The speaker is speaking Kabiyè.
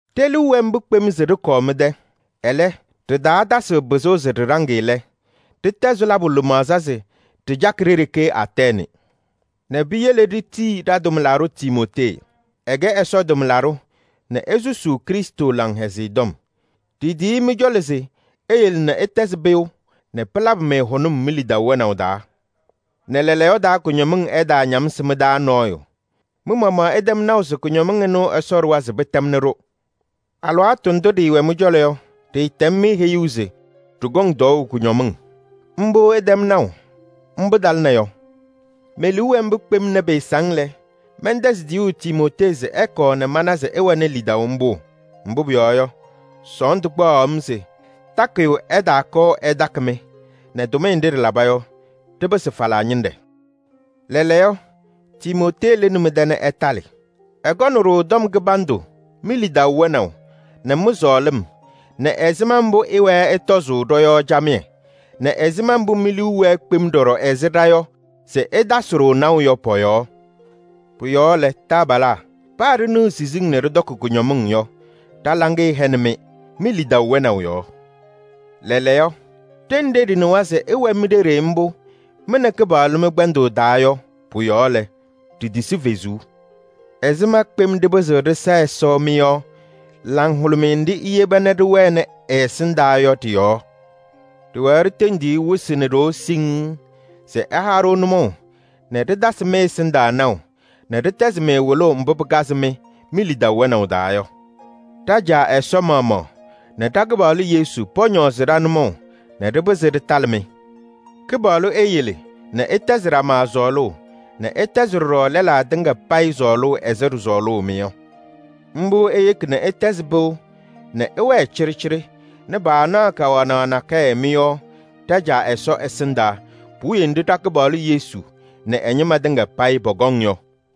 Ɖe-liu wɛ mbʋ kpem se ɖɩkɔɔ mɩ-tɛ nɛ pɩɩsɔsʋʋ lɛ, ɖɩtɛzɩ labʋ lɩmaɣza se ɖɩcaɣ ɖe-ɖeke Atɛɛnɩ nɛ piyele ɖitiyi ɖa-tʋmlaɖʋ Timootee. Ɛkɛ Ɛsɔ tʋmlaɖʋ nɛ esusuu Krɩstʋ Laŋhɛzɩyɛ Tɔm. Ɖitiyi-i mɩ-cɔlɔ se eyele nɛ ɩtɛzɩ pɩʋ nɛ pɩlabɩ-mɩ hʋnʋm mi-lidaʋ wɛnaʋ taa nɛ lɛɛlɛɛyɔ taa kʋñɔmɩŋ ɛtaañamsɩ mɩ-taa nɔɔyʋ. Mɩ-maɣmaɣ ɩtɛm naʋ se ɩnʋ Ɛsɔ ɖʋwa se pɩtɛmnɩ-ɖʋ. Alɩwaatʋ ndʋ ɖɩɩwɛ mɩ-cɔlɔ yɔ, ɖɩɩtɛm-mɩ heyuu se ɖɩkɔŋ tɔɔʋ kʋñɔmɩŋ. Mbʋ ɩtɛm naʋ, mbʋ talɩna yɔ. Me-liu wɛ mbʋ kpem nɛ pɩɩsɔsʋʋ lɛ, mɛntɛzɩ tiyuu Timootee se ɛkɔɔ nɛ mana se ɩwɛnɩ lidaʋ mbʋ? Mbʋ pʋyɔɔ yɔ, sɔɔndʋ kpaɣaɣ-m se takɩyʋ ɛtaakɔɔ ɛtakɩ-mɩ nɛ tʋmɩyɛ nɖɩ ɖɩlaba yɔ, ɖɩpɩsɩ falaa ñɩnɖɛ. Lɛɛlɛɛyɔ, Timootee lɩnɩ mɩ-tɛ nɛ ɛtalɩ. Ɛkɔnɩ-ɖʋ tɔm kɩbandʋ mi-lidaʋ wɛnaʋ nɛ mɩ-sɔɔlɩm nɛ ɛzɩma mbʋ ɩwɛɛ ɩtɔzʋʋ ɖɔ-yɔɔ camɩyɛ nɛ ɛzɩma mbʋ mi-liu wɛɛ kpem ɖɔɖɔ ɛzɩ ɖa yɔ se ɩtasɩ-ɖʋ naʋ yɔ pɔ-yɔɔ. Pʋ-yɔɔ lɛ, taabalaa, paa ɖɩnɩɣ siziŋ nɛ ɖɩtɔkɩ kʋñɔmɩŋ yɔ, ɖa-laŋɩyɛ hɛnɩ-mɩ mi-lidaʋ wɛnaʋ yɔɔ. Lɛɛlɛɛyɔ, ɖenɖe ɖɩnɩwa se ɩwɛ mi-ɖeɖe mbʋ mɩ nɛ Kɩpaɣlʋ mɩ-kpɛndʋʋ taa yɔ, pʋ-yɔɔ lɛ, ɖitisi fezuu. Ɛzɩma kpem ɖɩpɩzɩɣ ɖɩsa Ɛsɔ mɩ-yɔɔ laŋhʋlʋmɩyɛ nɖɩ iyeba nɛ ɖɩwɛnɩ ɛ-ɛsɩndaa yɔ ɖɩ-yɔɔ? Ɖɩwɛɛ ɖitendiɣ-i wɩsɩ nɛ ɖoo siŋŋ se ɛha-ɖʋ nʋmɔʋ nɛ ɖɩtasɩ mɩ-ɛsɩndaa naʋ nɛ ɖɩtɛzɩ-mɩ wɩlʋʋ mbʋ pɩkazɩ-mɩ mi-lidaʋ wɛnaʋ taa yɔ. Ɖa-Caa Ɛsɔ maɣmaɣ nɛ ɖa-Kɩpaɣlʋ Yesu pɔñɔɔzɩ ɖa-nʋmɔʋ nɛ ɖɩpɩzɩ ɖɩtalɩ-mɩ! Kɩpaɣlʋ eyele nɛ ɩtɛzɩ ɖama sɔɔlʋʋ nɛ ɩtɛzɩ ɖɔɖɔ lɛlaa tɩŋa payɩ sɔɔlʋʋ ɛzɩ ɖɩsɔɔlʋʋ-mɩ yɔ. Mbʋ eyeki nɛ ɩtɛzɩ pɩʋ nɛ ɩwɛɛ cɩɖɩcɩɖɩ nɛ paanaɣ kawanaɣ nakɛyɛ mɩ-yɔɔ ɖa-Caa Ɛsɔ ɛsɩndaa puwiye nɖɩ ɖa-Kɩpaɣlʋ Yesu nɛ ɛ-ñɩma tɩŋa payɩ pɔkɔŋ yɔ.